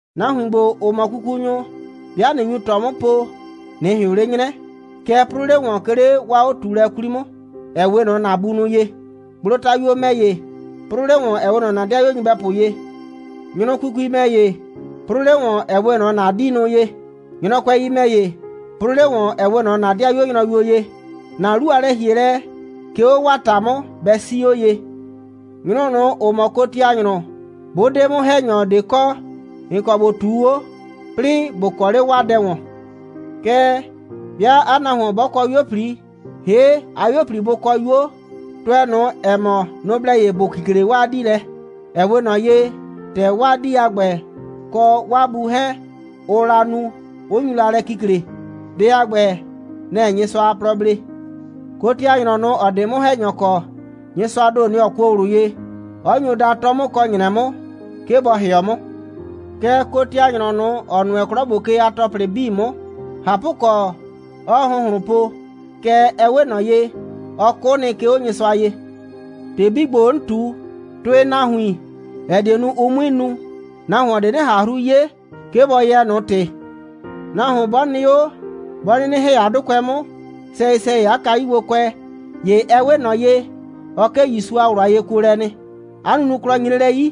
Nahuin ‑gbo, ‑ʋ mɔ kukunyʋ, 'bɩa ꞊nɩ nyu ꞊tɔ 'mʋ po, ꞊nɩ ꞊hɩʋn 'le 'nyrɛ, kɛɛ, 'prʋʋ 'le ‑wɔn, 'ke 'le 'waa 'o꞊tuulɛ 'kwli 'mʋ, ‑ɛ 'we ꞊nɔ ‑na bunʋ ye. Gblotayuo ‑mɛ ‑ye, 'prʋʋ 'le ‑wɔn, ‑ɛ 'we ꞊nɔ ‑na 'dɩayuo nyɩbɛpʋ ye. Nyrʋ kukui ‑mɛ ‑ye, 'prʋʋ 'le ‑wɔn, ‑ɛ 'we ꞊nɔ ‑na 'diinʋ ye. Nyrɔkʋɛi ‑mɛ ‑ye, 'prʋʋ 'le ‑wɔn, ‑ɛ 'we ꞊nɔ ‑na 'dɩayuo nyrʋyuo ye. ‑Na 'lu a lɛ‑hielɛ, 'ke 'o 'waa ‑ta 'mʋ, bɛ 'sii 'o ye. Nyrʋ ꞊nʋ, ‑ʋ mʋ kotianyrʋ, 'bʋ 'de 'mʋ‑hɛnyɔ ꞊de kɔ, ‑n kɔ ‑bo ꞊tuu 'o, 'plɩɩ ‑bo kɔ 'le 'waa dɛ ‑wɔn. Kɛɛ, 'bɩa 'a nahuon 'bɔ kɔ 'yuo꞊pli, ‑hee' 'a 'yuo꞊pli, 'bʋ kɔ 'yuo, tʋɛ ꞊nʋ, ‑ɛ mɔ, nʋ‑ blɛ ye ‑bʋ kikle 'waa 'dii lɛ, ‑ɛ 'we ꞊nɔ ye, ‑tɛ 'waa 'dii a ‑gbɛ kɔ 'waa bu 'hɛɛn, ʋʋ la nu, 'ʋ nyu la lɛ kikle. Dɛ a ‑gbɛ, nɛ‑ɛ Nyɩsʋa a plɔ blee. Kotianyrɔ ꞊nʋ, ‑ɔ 'de 'mʋ‑hɛnyɔ kɔ, Nyɩsʋaa ‑do, nɔ‑ ɔ kuo ꞊wlʋ ye, 'ɔ nyo da, 'tɔ 'mʋ kɔ ‑nyrɛ 'mʋ, 'ke bɔ ‑hɩɔ 'mʋ. Kɛɛ, kotianyrɔ ꞊nʋ, ‑ɔ nʋɛ 'klɔ ‑gbo ke a ‑tɔplɩ 'bii 'mʋ, ꞊hapʋkɔ, 'ɔɔ ‑hʋnhlʋn po, kɛɛ, ɛ 'we ꞊nɔ ye, ɔ 'kʋ nɩ, 'ke 'o Nyɩsʋa ye. ‑Tɩ 'bii ‑gbo, 'n ꞊tu, tʋɩ nahuin, ‑ɛ die nu, ʋ 'mui nu, nahuon ꞊de 'nɩ ꞊han 'hru 'ye, 'ke bɔ yɛɛ ꞊nʋ ‑tɩ. Nahuon 'bɔ nɩ 'o, 'bɔ 'nɩnɩ ‑hɛ 'a 'dʋkʋɛ 'mʋ, sɛyɩ‑sɛyɩ 'a kayugbokʋɛ, ‑ye ɛ 'we ꞊nɔ ye, ɔ 'kee ‑Yusu a ꞊wlʋ a yekuolɛ nɩ. 'A nunuklɔ nyre lɛ 'yi,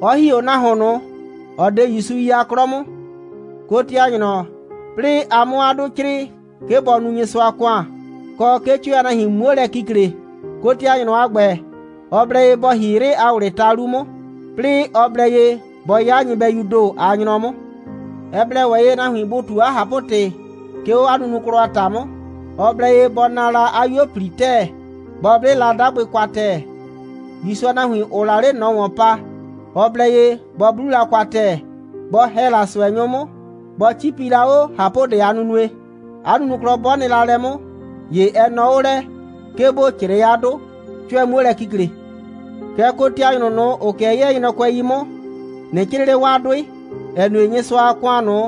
'ɔ ‑hi 'o nahuon ꞊nʋ, ‑ɔ 'de ‑Yusu yi a 'klɔ 'mʋ. Kotianyrɔ, 'plɩɩ a 'mʋ 'a 'dʋ 'crɩɩ, 'ke bɔ nu Nyɩsʋa a ‑kʋan, kɔ, 'ke 'cʋɛ a nahuin 'muo lɛ kikle, kotianyrɔ a ‑gbɛ, ɔ blɛ ye bɔ ‑hi 'yrɩ a ‑wlɩɩ ta 'lu 'mʋ, 'plɩɩ ɔ blɛ ye bɔ 'ya la nyɩbɛyuu ‑do a nyrɔ 'mʋ. Ɛ blɛ ‑wɛ ye, nahuin bʋ ꞊tu 'a ꞊hapʋ‑tɩ, 'ke 'o 'a nunuklɔ a ‑ta 'mʋ. Ɔ blɛ ye bɔ naa la 'a 'yuo꞊pli ‑tɛɛ, bɔ 'ble la 'dagbɩ kwa ‑tɛɛ. ‑Yusu a nahuin, ‑ʋʋ la 'le ꞊nɔ ‑wɔn pa, ɔ blɛ ye bɔ 'blu la kwa ‑tɛɛ, bɔ ‑hɛ la ꞊sʋɛnyʋ 'mʋ, bɔ 'cipi la 'o ꞊hapʋdɛ a nunue. 'A nunuklɔ 'bɔ nɩ la lɛ 'mʋ, ‑ye ɛ nɔɔ 'o lɛ, 'ke ‑bo 'crɩɩ 'a 'dʋ, 'cʋɛ 'muo lɛ kikle. Kɛɛ, kotianyrʋ ꞊nʋ, ‑ʋ 'kɩɛ 'yɛɛ nyrɔkʋɛi 'mʋ, ꞊nɩ 'crɩɩ 'le 'waa 'dʋɩ, ‑ɛ nue, Nyɩsʋa a ‑kʋan ꞊nʋ,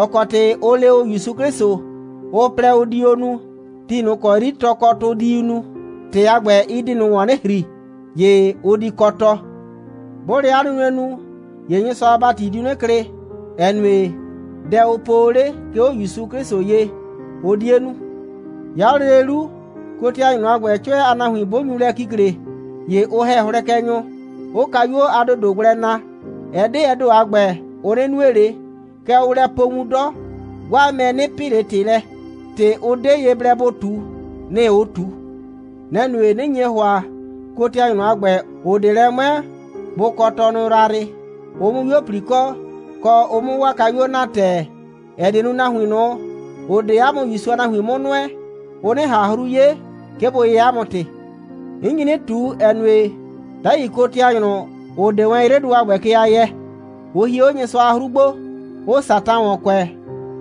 ‑ɔ kɔ ‑tɩ ʋ le o ‑Yusu 'Klɩsʋ, ʋ plɛ, ʋ di o nu, ti ꞊nʋ ‑kɔ 'yri tɔkɔtʋ diu nu, ‑tɩ a ‑gbɛ, ɩ di ꞊nʋ ‑wɔn 'nɩ ‑hri, ‑ye ʋ di kɔ tɔ. 'Bʋʋ lɛ 'a nunue nu, ‑ye Nyɩsʋa a ‑bati diu 'nɩ klɩ, ‑ɛ nue, dɛ, ʋ po o 'le, 'ke 'o ‑Yusu 'Klɩsʋ ye, ʋ 'die nu. 'Ya 'o lele 'lu, kotianyrʋ a ‑gbɛ, 'cʋɛ a nahuin 'bʋ nyu lɛ kikle, ‑ye ʋ ‑hɛ hlɛkɛnyʋ, 'ʋʋ kayuo a ‑dodo gblɛ naa. Ɛ 'de ɛ ‑do a ‑gbɛ, ʋ 'nɩ nue ꞊le, kɛɛ, ʋʋ lɛ po wun 'dɔ, 'waa mɛ 'nɩ pɩ ꞊le ‑tɩ lɛ. ‑Tɩ, ʋ 'de ye blɛ bʋ ꞊tu, nɩ‑ ʋʋ ꞊tu. Nɛ‑ nue, 'nɩ nye ‑hʋa, kotianyrʋ a ‑gbɛ, ‑ʋ 'de lɛ 'mʋɛɛ, bʋ kɔ tɔnʋ yrayrɩ, ʋ 'mʋ 'yuo꞊pli kɔ, kɔ, ʋ 'mʋ 'waa kayuo naa ‑tɛɛ, ‑ɛ die nu, nahuin ꞊nʋ, ‑ʋ 'de ‑a mʋ ‑Yusu a nahuin 'mʋ nʋɛ, ʋ 'nɩ ꞊han 'hru 'ye, 'ke bʋ yɛɛ ‑a mʋ ‑tɩ. 'N nyi 'nɩ ꞊tu, ‑ɛ nue, 'dai kotianyrʋ, ‑ʋ 'de wɛn 'yrɩdʋ a ‑gbɛ ke a yɛɛ, ʋ hie 'o Nyɩsʋa a 'hru gbo, 'ʋʋ Satan ‑wɔn kʋɛ,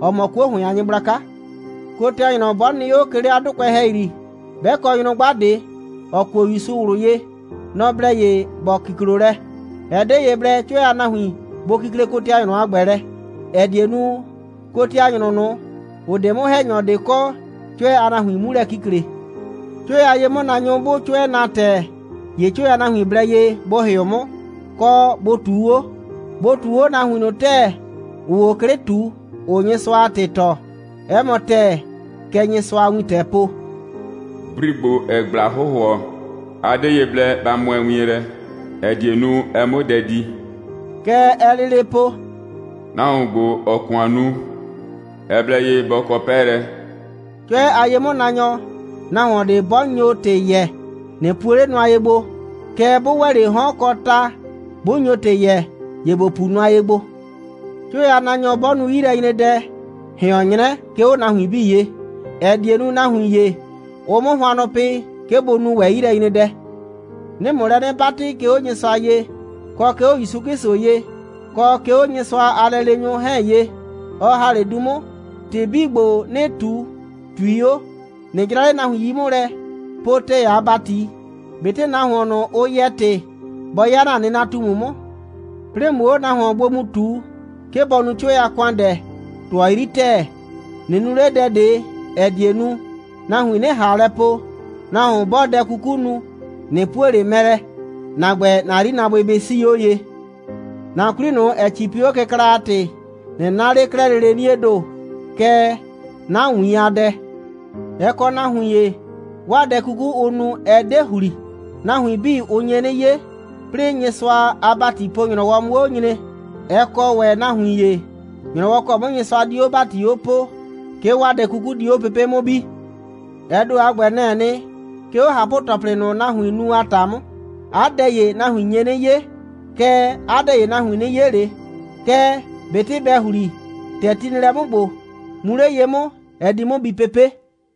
‑ɔ mɔ 'kuo ‑hʋɩn a nyɩgblaka. Kotianyrɔ 'bɔ nɩ 'o, 'ke 'le 'a 'dʋkʋɛ ‑hɛyri, 'bɛ kɔ nyrʋgba ꞊de, ‑ɔ kuo ‑Yusu ꞊wlʋ ye, nɔ‑ blɛ ye ‑bɔ kiklo lɛ. Ɛ 'de ye blɛ, 'cʋɛ a nahuin bʋ kikle kotianyrʋ a ‑gbɛ lɛ, ‑ɛ die nu, kotianyrʋ ꞊nʋ, ‑ʋ 'de 'mʋ‑hɛnyɔ ꞊de kɔ, 'cʋɛ a nahuin 'mu lɛ kikle. 'Cʋɛ a ye'mʋnaanyʋ, 'bʋʋ 'cʋɛ naa ‑tɛɛ, ‑ye 'cʋɛ a nahuin blɛ ye bʋ ‑hɩʋ 'mʋ, kɔ, bʋ ꞊tuu 'o. Bʋ ꞊tuu 'o nahuin ꞊nʋ ‑tɛɛ, ‑ʋʋ 'o 'klɩ ꞊tu, ‑ʋʋ Nyɩsʋa a ‑tɩ tɔɔ. 'Ɛ mɔ ‑tɛɛ, kɛ Nyɩsʋa a wintɛɛ po: «Bri ‑gbo, ‑ɛɛ ꞊gbla hʋhʋɔ, a 'de ye blɛ ba mʋɛ wien lɛ, ‑ɛ die nu, ɛ 'mʋ dɛ di.» Kɛ ɛɛ lele po: «Nahuon ‑gbo, ‑ɔɔ ‑kʋan nu, ɛ blɛ ye bɔ kɔ 'pɛɛlɛ.» 'Cʋɛ a ye'mʋnaanyɔ, nahuon ꞊de 'bɔ nyo ‑tɩ yɛɛ, ꞊nɩ puo 'le nʋa ye gbo, kɛɛ, 'bʋ ‑wɛ 'le 'hɔn kɔ ta, 'bʋ nyo ‑tɩ yɛɛ, ‑ye ‑bo pu nʋa ye gbo. 'Cʋɛ a ye'mʋnaanyɔ 'bɔ nu 'yilɛnyredɛ, ꞊hɩɔn 'nyrɛ, 'ke 'o nahuin 'bii ye, ‑ɛ die nu, nahuin ‑ye, ʋ 'mʋ hʋannʋ pɩ, 'ke bʋ nu ‑wɛ 'yilɛnyredɛ. 'Nɩɩ ‑mʋ lɛ 'nɩ 'batɩ, 'ke 'o Nyɩsʋa ye, kɔ 'ke 'o ‑Yusu 'Klɩsʋ ye, kɔ 'ke 'o Nyɩsʋa a lɛleenyʋ 'hɛɛn ye, ɔ ‑ha 'le du 'mʋ, ‑tɩ 'bii ‑gbo, 'nɩɩ ꞊tu, ꞊tui 'o. ꞊Nɩ 'jra 'le nahuin 'yi 'mʋ lɛ, po ‑tɛɛ a ‑bati, ꞊betɩ nahuon ꞊nʋ, ʋ yɛɛ ‑tɩ, bɔ 'ya ‑na nɩnatumu 'mʋ. 'Plɩɩ ꞊mʋ 'o nahuon gbo mu ꞊tu, 'ke bɔ nu 'cʋɛ a ‑kʋandɛ, ꞊tʋɔ 'yri ‑tɛɛ. ꞊Nɩ nu 'le dɛ ꞊de, ‑ɛ die nu, nahuin 'nɩ ꞊han lɛ po, nahuon 'bɔɔ dɛ 'kuku nu, ꞊nɩ puo ꞊le mɛ lɛ. ‑Na ‑gbɛ, ‑na 'yrinaabʋɩ bɩ 'sii 'o ye. ‑Na 'kwli ꞊nʋ, ‑ɛ 'cipi 'o kɩkla a ‑tɩ, ꞊nɩ 'na 'le 'klɛɛ lele 'niee ‑do, kɛɛ, 'na ‑wiin a dɛ. Ɛ kɔ nahuin ‑ye, 'waa dɛ 'kuku, ʋʋ nu, ɛ 'de ‑hli. Nahuin 'bii, ʋ nye 'nɩ 'ye, 'plɩɩ Nyɩsʋa a ‑batipo‑nyrɔwɔ 'mʋ 'o nyre. Ɛ kɔ ‑wɛ nahuin ‑ye, ‑nyrɔwɔ ‑kɔ 'mʋ Nyɩsʋa di 'o ‑bati 'o poo, 'ke 'waa dɛ 'kuku di 'o pepe' 'mʋ bi. Ɛ ‑do a ‑gbɛ, nɛ‑ɛ nɩ, 'ke 'o ꞊hapʋ‑tɔplɩ ꞊nʋ, nahuiin nu a ‑ta 'mʋ. 'A dɛ ‑ye, nahuin nye 'nɩ 'ye. Kɛɛ, 'a dɛ ‑ye, nahuin 'nɩ 'ye ꞊le. Kɛɛ, ꞊betɩ bɛ ‑hli, ‑tɛ ti nɩ lɛ 'mʋ ‑gbo, mu 'le ye 'mʋ, ɛ di 'mʋ bi pepe'.